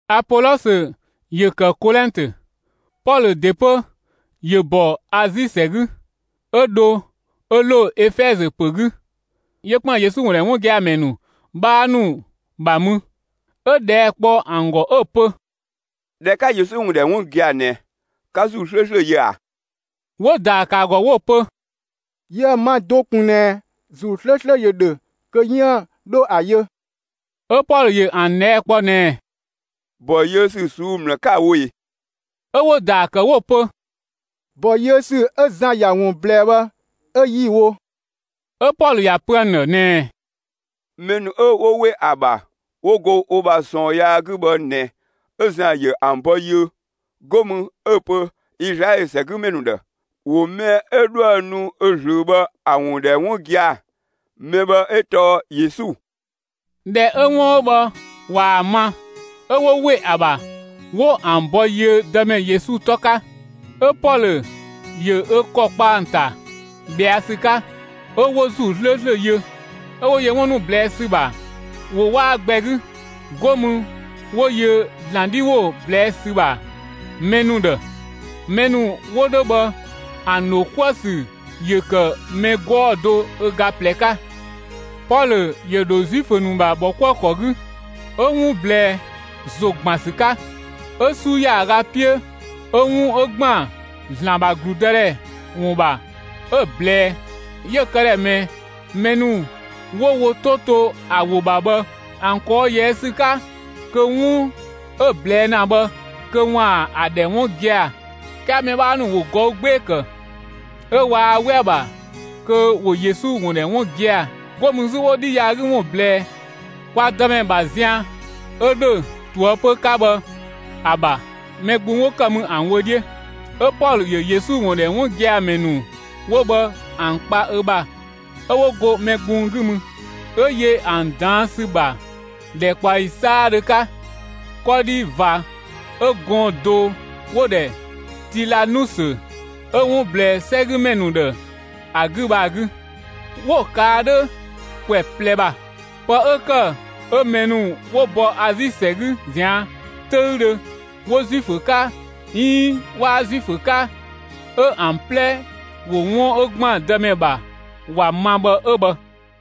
Apolɔsö ‑yö ‑kë Kolɛntö; Pɔlö ‑de 'pö ‑yö ‑bɔ Azi ‑sɛ 'gü, 'ö dho 'ö ‑lo Efɛzö ‑pö 'gü. 'Yö ‑kpën Yesu ‑wun ‑dhɛ 'wun gia‑ ‑mɛ ‑nu 'bhaa ‑nu ‑bha mü. 'Ö ꞊dhɛɛ' kpɔ ‑an ‑gɔ 'ö‑ pö: «꞊Dhɛ 'ka Yesu ‑wun ‑dhɛ 'wun gia‑ ꞊nɛ, 'ka ‑Zuu 'slööslö yö ꞊a?» 'Wo‑ ‑daa ‑kë ‑a ‑gɔ 'wo‑ pö: «Yiëë‑ ma do ꞊kun ꞊nɛ ‑Zuu 'slööslö ‑yö ‑dhö kö 'yiën‑ 'dho ‑a yö.» 'Ö Pɔlö ‑yö ‑an ꞊dhɛɛ' kpɔ ꞊nɛɛ: «‑Bɔ yiö ‑sü ꞊suu'‑ ‑mlë 'ka‑ wo ꞊e?» 'Ö 'wo‑ ‑daa ‑kë 'wo‑ pö: «‑Bɔ yiö ‑sü 'ö Zan ‑ya ‑wun ꞊blɛɛ bhë 'ö 'yi‑ wo.» 'Ö Pɔlö ‑ya pö ‑an ‑dhë ꞊nɛɛ: «Mɛ ‑nu 'ö 'wo ‑we ‑a ‑bha 'wo go wo ‑bha ꞊sɔɔn yaa 'gü bhë ꞊nɛ 'ö Zan ‑yö ‑an ‑bɔ yiö. 'Go mü 'ö‑ pö Izlaɛlö ‑sɛgümɛ ‑nu ‑dhë, ‑wo mɛ 'ö 'dhoë‑ nu ö ꞊zlöö bhë ‑a ‑wun ‑dhɛ 'wun gia‑; mɛ bhë 'ö tɔɔ Yesu.» ꞊Dhɛ 'ö 'wun 'ö bhë ꞊waa‑ ma, 'ö 'wo ‑we ‑a ‑bha 'wo ‑an ‑bɔ yiö Dëmɛ Yesu 'tɔ 'ka. 'Ö Pɔlö ‑yö ö ‑kɔ kpa ‑an ‑ta ꞊bhɛa' ‑sü 'ka, 'ö 'wo ‑Zuu 'slööslö yö. 'Ö 'wo yö 'wun ‑nu ꞊blɛɛ' ‑sü ‑bha ‑wo 'waa gbɛ 'gü. 'Go mü 'wo yö ‑Zlan 'dhi ‑wo ꞊blɛɛ' ‑sü ‑bha mɛ ‑nu ‑dhë. Mɛ ‑nu 'wo 'dhö bhë ‑an ‑dho 'kuë‑ ‑sü ‑yö ‑kë mɛ 'gɔɔ‑ do ö ga ꞊plɛ 'ka. Pɔlö ‑yö ‑dho Zuifö ‑nu ‑bha ‑bhɔkuëkɔ 'gü, 'ö 'wun ꞊blɛɛ ‑zo ‑gban ‑sü 'ka. 'Ö 'su ‑yaaga 'piö 'ö 'wun 'ö ‑gban ‑Zlan ‑bha ‑gludëdhɛ ‑wun ‑bha 'ö‑ ꞊blɛɛ; 'yö‑ këdhɛ ꞊mɛɛ mɛ ‑nu 'wo wo 'to to ‑a ‑wo ‑bha bhë ‑an ꞊kɔɔ' ꞊yɛɛ' ‑sü 'ka kö 'wun 'ö‑ ꞊blɛɛ' ‑na bhë kö ‑waan ‑a ‑dhɛ 'wun gia‑. 'Kɛɛ mɛ 'bhaa ‑nu ‑wo ꞊gɔü' 'gbee‑ ‑kë, 'ö waa 'we ‑a ‑bha kö ‑wo Yesu ‑wun ‑dhɛ 'wun gia‑. 'Go mü 'zü 'wo 'dhi yaa 'gü ‑wun ꞊blɛɛ kwa Dëmɛ ‑bha zian 'ö ‑dho ꞊toëpö 'ka bhë ‑a ‑bha, mɛ gbung 'wo ‑kë mü ‑an wö 'dhiö. 'Ö Pɔlö ‑yö Yesu ‑wun ‑dhɛ 'wun gia‑ ‑mɛ ‑nu 'wo bhë ‑an kpa ö ‑bha 'ö 'wo go mɛ gbung 'gü mü. 'Ö yö ‑an ꞊daan' ‑sü ‑bha ‑dhɛkpaɔyi 'saadhö 'ka, 'kɔdhi ꞊va 'ö gɔɔn‑ do 'wo‑ ‑dhɛ Tilanusö 'ö 'wun ꞊blɛɛ 'sɛgümɛ ‑nu ‑dhë ‑a 'gü bhë ‑a 'gü. 'Wo‑ ꞊kaa' 'dhö ‑kwɛ ꞊plɛ ‑bha. Pë 'ö ‑kë 'ö mɛ ‑nu 'wo bɔ Azi ‑sɛ 'gü ꞊zian' 'töüdhö 'wo Zuifö 'ka, 'iin 'waa Zuifö 'ka, 'ö ‑an 'plɛ ‑wo 'wun 'ö ‑gban Dëmɛ ‑bha ‑wa ma bhë 'ö bhë.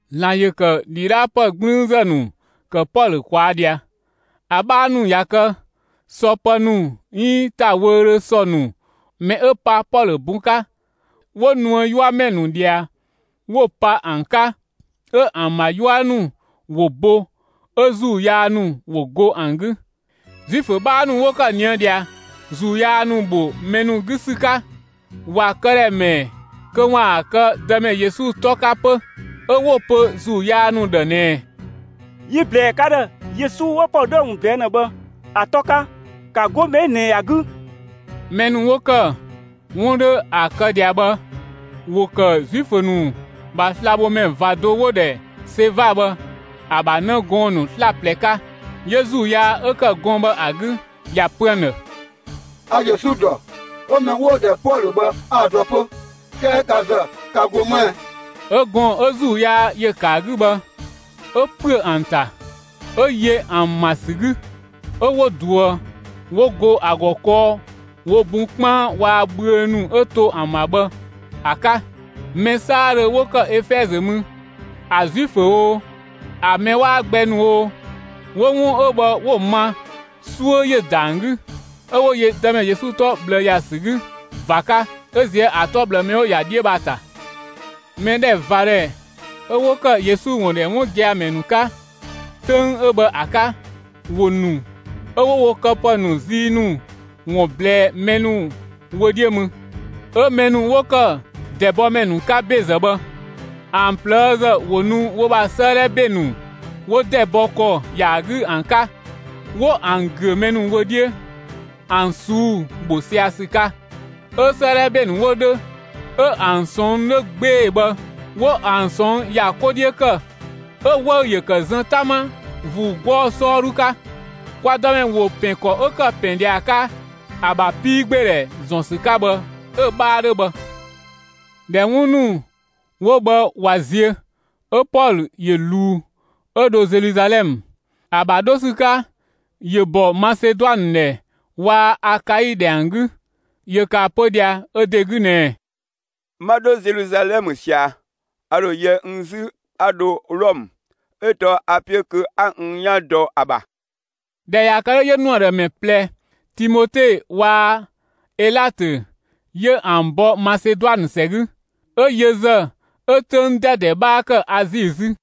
‑Zlan ‑yö ‑kë ‑dhidhaapë 'gblüünzë ‑nu ‑kë Pɔlö ꞊kwaa' ꞊dhia. ‑A 'bhaa ‑nu ꞊ya kë, sɔ pë ‑nu 'iin ‑ta wöödhö sɔ ‑nu mɛ 'ö pa Pɔlö bun 'ka, 'wo ꞊nuë' 'yuamɛ ‑nu ꞊dhia, 'wo‑ pa ‑an 'ka, 'ö ‑an ‑bha 'yua ‑nu ‑wo bo, 'ö ‑zuu yaa ‑nu ‑wo go ‑an 'gü. Zuifö 'bhaa ‑nu 'wo ‑kë ꞊nië ꞊dhia, ‑zuu yaa ‑nu ‑bho mɛ ‑nu 'gü ‑sü 'ka, ‑wa këdhɛ ‑mɛɛ kö ‑waan kë Dëmɛ Yesu 'tɔ 'ka 'pö. 'Ö 'wo‑ pö ‑zuu yaa ‑nu ‑dhë ꞊nɛɛ: «Yi‑ ꞊blɛɛ ka ‑dhë Yesu 'ö Pɔlö 'dhö ‑a ‑wun ꞊blɛɛ' ‑na bhë ‑a 'tɔ 'ka, ‑ka 'go mɛ 'ö ꞊nɛ ‑a 'gü!» (Mɛ ‑nu 'wo ‑kë 'wun 'dhö ‑a kë ꞊dhia bhë, ‑wo ‑kë Zuifö ‑nu ‑bha slabhomɛ ꞊va do 'wo‑ ‑dhɛ Seva bhë ‑a ‑bha 'në gɔɔn‑ ‑nu 'slaplɛ 'ka.) 'Yö ‑zuu yaa 'ö ‑kë gɔɔn‑ bhë ‑a 'gü ‑ya ‑pö ‑an ‑dhë: «A Yesu ‑dɔ, 'ö mɛ 'wo‑ ‑dhɛ Pɔlö bhë 'a‑ dɔ 'pö; 'kɛɛ ka ‑zë, ka ‑go 'më ɛ?» 'Ö gɔɔn‑ 'ö ‑zuu yaa ‑yö ‑kë ‑a 'gü bhë, 'ö ‑püö ‑an ‑ta, 'ö yö ‑an ‑ma ‑sü 'gü, 'ö 'wo ꞊duë, 'wo go ‑a ‑gɔ kɔɔ wo bun 'kpaan waa‑ bhüö ‑nu 'ö to ‑an ‑bha bhë ‑a 'ka. Mɛ 'saadhö 'wo ‑kë Efɛzö mü, ‑a Zuifö oo, ‑a mɛ 'waa gbɛ ‑nu oo, 'wo 'wun 'ö bhë 'wo‑ ma, 'suö ‑yö ‑da ‑an 'gü, 'ö 'wo yö Dëmɛ Yesu 'tɔ ꞊bhlë ‑ya ‑sü 'gü ꞊va 'ka, 'ö ꞊zië' ‑a 'tɔ ꞊bhlë mɛ 'wo‑ ‑ya 'dhiö bhë ‑a ‑ta. Mɛdhɛvadhɛ 'ö 'wo kë Yesu ‑wun ‑dhɛ 'wun gia‑ ‑mɛ ‑nu 'ka, 'töng 'ö bhë ‑a 'ka, ‑wo ‑nu 'ö 'wo wo këpë ‑nu zii ‑nu ‑wun ꞊blɛɛ mɛ ‑nu wö 'dhiö mü. 'Ö mɛ ‑nu 'wo ‑kë ‑dɛbɔmɛ ‑nu 'ka ‑bezë bhë, ‑an ꞊plëëzë ‑wo nu wo ‑bha 'sëëdhɛ ‑be ‑nu 'wo ‑dɛ bɔ ‑kɔ ‑ya 'gü ‑an 'ka, 'wo ‑an ‑güö mɛ ‑nu wö 'dhiö ‑an ꞊suu'‑ ‑bho sia‑ ‑sü 'ka. 'Ö 'sëëdhɛ ‑be ‑nu 'wo 'dhö 'ö ‑an ꞊sɔnng' 'dhö 'gbee‑ bhë 'wo ‑an ꞊sɔnng' ‑ya 'ko 'dhiö ‑kë, 'ö‑ 'wëü‑ ‑yö ‑kë zën 'tama ‑vuu 'gɔɔ‑ 'sɔɔdhu 'ka. Kwa Dëmɛ ‑wo ‑pɛn ‑kɔ 'ö ‑kë ‑pɛn ꞊dhia ‑a 'ka ‑a ‑bha 'piigbeedhɛ ‑zɔn ‑sü 'ka bhë 'ö‑ 'bhaa 'dhö bhë. ꞊Dhɛ 'wun ‑nu 'wo bhë ꞊wa ziö, 'ö Pɔlö ‑yö ꞊luu 'ö 'dho Zeluzalɛmë. ‑A ‑bha 'dho ‑sü 'ka, 'yö ‑bɔ Maseduanë ‑dhɛ waa‑ Akai ‑dhɛ ‑an 'gü. ‑Yö ‑kë ‑a pö ꞊dhia ö ‑de 'gü ꞊nɛɛ: «'Ma 'dho Zeluzalɛmë ꞊sia, a ‑dho yɛ n 'zü 'a dho Wlɔmë, 'ö tɔɔ a‑ 'piö kö 'a n 'yan dɔ ‑a ‑bha.» ꞊Dhɛ ꞊ya kë 'dhö, 'yö ‑nu ‑a ‑dhë ‑mɛ ꞊plɛ Timote waa‑ Elatö 'yö ‑an bɔ Maseduanë ‑sɛ 'gü; 'ö yö ‑zë 'ö 'töng 'dɛdɛ 'bhaa ‑kë Azi 'zü.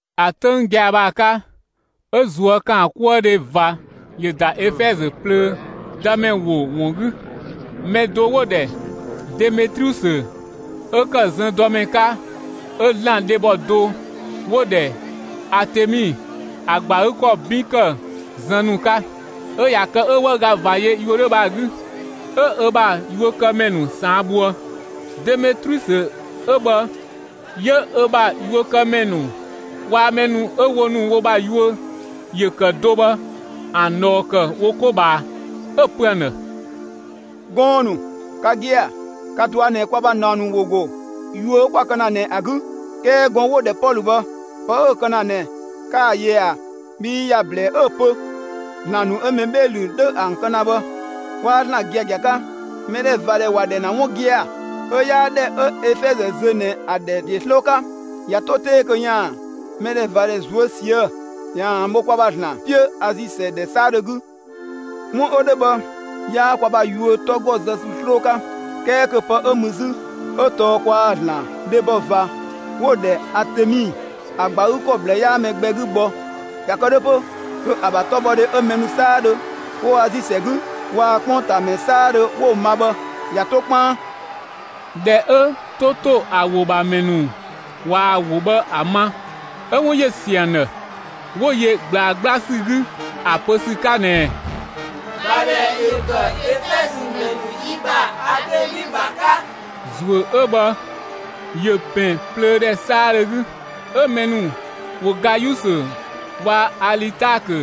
‑A 'töng gia‑ bhë ‑a 'ka, 'ö ꞊zuökaankuëdhe ꞊va ‑yö ‑da Efɛzö plöö Dëmɛ ‑wo ‑wun 'gü. Mɛ do 'wo‑ ‑dhɛ Demetriusö 'ö ‑kë zëndɔmɛ 'ka 'ö ‑zlan dhebɔ do 'wo‑ ‑dhɛ Atemi ‑a ‑gba ‑a 'gü ‑kɔ 'bin ‑kë zën ‑nu 'ka. 'Ö ꞊ya kë 'ö 'wëüga ꞊va yö yuö 'dhö bhë ‑a 'gü, 'ö ö ‑bha yuökëmɛ ‑nu ꞊saan' bhoë. Demetriusö 'ö bhë 'yö ö ‑bha yuökëmɛ ‑nu waa‑ mɛ ‑nu 'ö wo ‑nu wo ‑bha yuö ‑yö ‑kë do bhë ‑an ꞊dhɔɔ ‑kë wo 'ko ꞊bhaa; 'ö‑ pö ‑an ‑dhë: «Gɔɔn‑ ‑nu, ka gia‑, ka‑ ꞊dɔa' ꞊nɛ kwa ‑bha ꞊naɔ ‑nu ‑wo ‑go yuö 'ö 'kwa‑ kë ‑na ꞊nɛ ‑a 'gü. 'Kɛɛ gɔɔn‑ 'wo‑ ‑dhɛ Pɔlö bhë, pë 'ö‑ kë ‑na ꞊nɛ, 'kaa‑ yö ꞊a? Bhii ‑ya ‑blɛɛ 'ö‑ pö ‑zlan ‑nu 'ö mɛ 'bhee‑ ‑lü 'dhö ‑an kë ‑na bhë 'waa ‑zlan giagia 'ka. Mɛdhɛvadhɛ ‑wa ‑dhɛ ‑na 'wun gia‑, 'ö 'yaa ‑dhɛ 'ö Efɛzö zö ꞊nɛ ‑a ‑dhɛ ‑de 'sloo 'ka, ꞊ya 'to 'tee kö ‑yaan mɛdhɛvadhɛ ꞊zuö' ꞊sië'‑, ‑yaan ‑an bho kwa ‑bha ‑zlan 'piö Azi ‑sɛ ‑dhɛ 'saadhö 'gü. 'Wun 'ö 'dhö bhë 'yaa kwa ‑bha yuö 'tɔ ‑gɔ zë ‑sü 'sloo 'ka, 'kɛɛ kö pë 'ö mü 'zü, 'ö tɔɔ kwaa‑ ‑zlan dhebɔ ꞊va 'wo‑ ‑dhɛ Atemi ‑a ‑gba ‑a 'gü ‑kɔ ꞊bhlë 'yaa mɛ gbɛ 'gü gbɔ. ꞊Ya kë 'dhö 'pö, kö ‑a ‑bha 'tɔbhɔdhe 'ö mɛ ‑nu 'saadhö 'wo Azi ‑sɛ 'gü waa‑ 'kpongtaamɛ 'saadhö 'wo‑ ma bhë ꞊ya 'to 'kpaan.» ꞊Dhɛ 'ö 'to ‑to ‑a ‑wo ‑bha ‑mɛ ‑nu ꞊waa‑ ‑wo bhë ‑a ma, 'ö 'wun ‑yö ‑siö ‑an ‑dhë, 'wo yö ꞊gblaa 'gbla ‑sü 'gü ‑a ‑pö ‑sü 'ka ꞊nɛɛ: «꞊Vadhɛ ‑yö kë Efɛzö ‑mɛ ‑nu yi ‑bha Atemi ‑bha 'ka!» ‑Zuö 'ö bhë ‑yö ‑pɛn plöö ‑dhɛ 'saadhö 'gü. 'Ö mɛ ‑nu ‑wo Gayusö waa‑ Alitaakö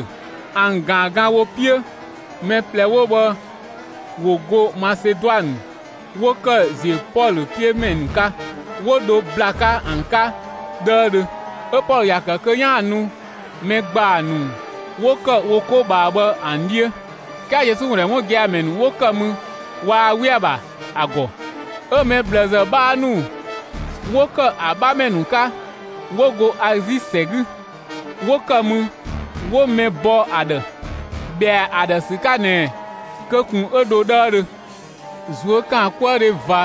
‑an ꞊gaan gan wo 'piö (mɛ ꞊plɛ 'wo bhë ‑wo go Maseduanë, 'wo ‑kë ‑ziö Pɔlö 'piö ‑mɛ ‑nu 'ka); 'wo dho ‑bla 'ka ‑an 'ka 'dhëëdhö. 'Ö Pɔlö ‑ya ‑kë kö 'yaan‑ nu mɛ ‑gbaa ‑nu 'wo ‑kë wo 'ko ꞊bhaa bhë ‑an 'dhiö. 'Kɛɛ Yesu ‑wun ‑dhɛ 'wun gia‑ ‑mɛ ‑nu 'wo ‑kë mü waa 'we ‑a ‑bha ‑a ‑gɔ. 'Ö mɛ ꞊bhlëzë 'bhaa ‑nu 'wo ‑kë ‑a 'bhamɛ ‑nu 'ka 'wo go Azi ‑sɛ 'gü, 'wo ‑kë mü 'wo mɛ bɔ ‑a ‑dhë, ‑bhɛa ‑a ‑dhë ‑sü 'ka ꞊nɛ kö ꞊kun 'ö dho 'dhëëdhö. ꞊Zuökaankuëdhe ꞊va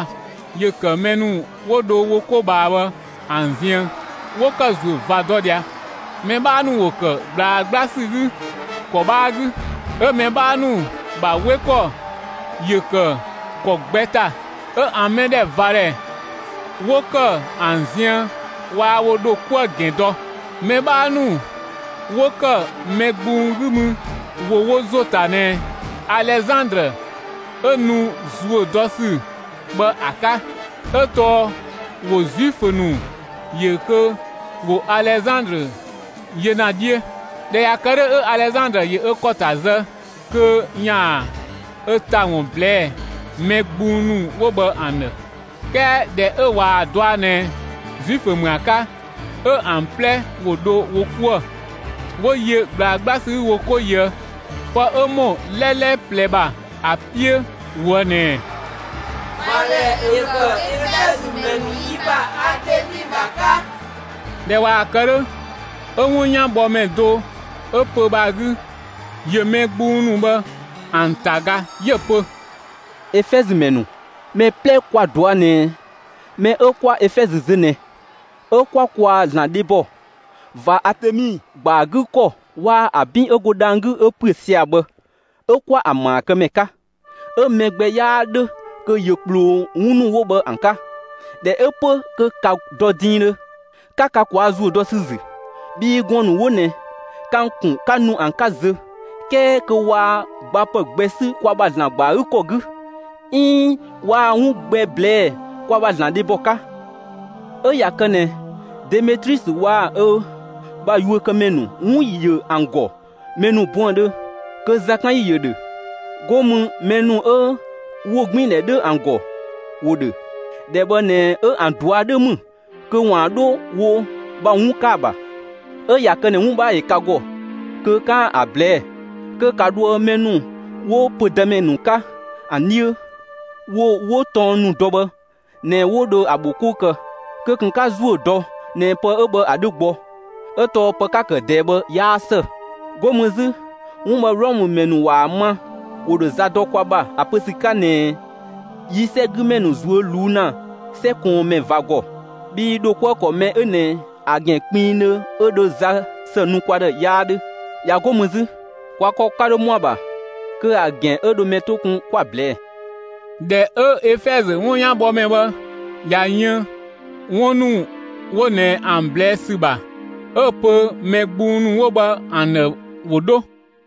‑yö ‑kë mɛ ‑nu 'wo dho wo 'ko ꞊bhaa bhë ‑an ziën, 'wo ‑kë ‑zuö ꞊va dɔ ꞊dhia. Mɛ 'bhaa ‑nu ‑wo ‑kë ꞊gblaa 'gbla ‑sü 'gü ‑kɔ 'bhaa 'gü, 'ö mɛ 'bhaa ‑nu ‑bha 'we ‑kɔ ‑yö ‑kë ‑kɔ gbɛ ‑ta. 'Ö ‑an mɛdhɛvadhɛ 'wo ‑kë ‑an ziën waa wo ‑dho 'kuë‑ ‑gɛn dɔ. Mɛ 'bhaa ‑nu 'wo ‑kë mɛ gbung 'gü mü, ‑wo wo ‑zo ‑ta ꞊nɛ Alezandrë 'ö nu ‑zuö dɔ ‑su bhë ‑a 'ka 'ö tɔɔ ‑wo Zuifö ‑nu ‑yö kö ‑wo Alezandrë yö ‑na 'dhiö. ꞊Dhɛ ꞊ya kë 'dhö, 'ö Alezandrë ‑yö ö ‑kɔ ‑ta zë kö ‑yaan ö ‑ta ‑wun ꞊blɛɛ'‑ mɛ gbung ‑nu 'wo bhë ‑an ‑dhë. 'Kɛɛ ꞊dhɛ 'ö ꞊waa‑ dɔa ꞊nɛ Zuifö ‑mü ‑a 'ka, 'ö ‑an 'plɛ ‑wo dho wo 'kuë‑, 'wo yö ꞊gblaa 'gbla ‑sü 'gü wo 'ko ꞊yöë', pë 'ö ‑mɔ 'lɛlɛ ꞊plɛ ‑bha ‑a 'piö ꞊woë' ꞊nɛɛ: «꞊Vadhɛ ‑yö kë Efɛzö ‑mɛ ‑nu yi ‑bha Atemi ‑bha 'ka!» ꞊Dhɛ ꞊waa‑ kë 'dhö, 'ö 'wunyanbhɔmɛ do 'ö pö‑ bhë ‑a 'gü, ‑yö mɛ gbung ‑nu bhë ‑an ‑ta ga, 'yö‑ pö: «Efɛzö ‑mɛ ‑nu, mɛ 'plɛ kwa‑ ꞊dɔa' ꞊nɛ mɛ 'ö 'kwa Efɛzö zö ꞊nɛ, 'ö 'kwa kwaa‑ ‑zlan dhebɔ ꞊va Atemi ‑gba ‑a 'gü ‑kɔ waa‑ ‑a 'bin 'ö go dhang‑ 'gü 'ö ‑püö sia‑ bhë 'ö 'kwa ‑an ‑maa ‑kë ‑mɛ 'ka. 'Ö mɛ gbɛ 'yaa ‑dhö kö ‑yö ꞊kploo 'wun ‑nu 'wo bhë ‑an 'ka. ꞊Dhɛ 'ö 'pö kö ‑ka dɔ diindhö, 'ka ka ꞊kwaa' ‑zuö dɔ ‑sü ‑zü! Bhii gɔɔn‑ ‑nu 'wo ꞊nɛ ka ‑an ‑kun 'ka nu ‑an 'ka zö, 'kɛɛ kö waa gbapë gbɛ 'sü kwa ‑bha ‑zlan ‑gba ‑a 'gü ‑kɔ 'gü, 'iin waa 'wun gbɛ ꞊blɛɛ'‑ kwa ‑bha ‑zlan dhebɔ 'ka. 'Ö ꞊ya kë ꞊nɛ Demetriusö waa‑ ö ‑bha yuökëmɛ ‑nu 'wun ‑yö ‑an ‑gɔ mɛ ‑nu buëndhö kö zakanyi ‑yö ‑dhö; 'go mü mɛ ‑nu 'ö ‑wogbiindhɛ 'dhö ‑an ‑gɔ 'wo ‑dhö. ‑Dhɛ bhë ꞊nɛ 'ö ‑an ꞊dua' 'dhö ‑mü kö ‑waan 'dho wo ‑bha 'wun 'ka ‑a ‑bha! 'Ö ꞊ya kë ꞊nɛ 'wun 'bhaa ‑yö ka ‑gɔ kö 'kaan‑ ‑a ꞊blɛɛ'‑, kö ‑ka dhoë mɛ ‑nu 'wo pödëmɛ ‑nu 'ka ‑an 'dhiö, wo 'wo tɔng ‑nu dɔ bhë ꞊nɛ 'wo dho ‑a ‑bho 'kou kë. Kö ꞊kun 'ka ‑zuö dɔ ꞊nɛ pë 'ö bhë ‑a 'dhö gbɔ! 'Ö tɔɔ pë 'ka‑ ‑kë ꞊dɛɛ bhë 'yaa ‑së. 'Go mü 'zü, 'wun bhë Wlɔmë ‑mɛ ‑nu ꞊waa‑ ma, ‑wo ‑dho za dɔ kwa ‑bha ‑a pö ‑sü 'ka ꞊nɛ yi 'sɛgümɛ ‑nu ꞊zuö' ꞊luu' ‑na 'sɛ ꞊kɔɔnmɛ ꞊va ‑gɔ. Bhii ‑dho 'kuë‑ ‑kɔ mɛ 'ö ꞊nɛ ‑a ‑gɛn kpinngdhö 'ö dho za ‑së nu kwa ‑dhë 'yaa 'dhö. ꞊Ya 'go mü 'zü, kwa ‑kɔ 'ka 'dho ‑mɔa ‑bha kö ‑a ‑gɛn 'ö dho mɛ 'to kun 'kwa‑ ꞊blɛɛ'‑.» ꞊Dhɛ 'ö Efɛzö 'wunyanbhɔmɛ bhë ꞊ya yën 'wun ‑nu 'wo ꞊nɛ ‑an ꞊blɛɛ' ‑sü ‑bha, 'ö‑ pö mɛ gbung ‑nu 'wo bhë ‑an ‑dhë ‑wo 'dho.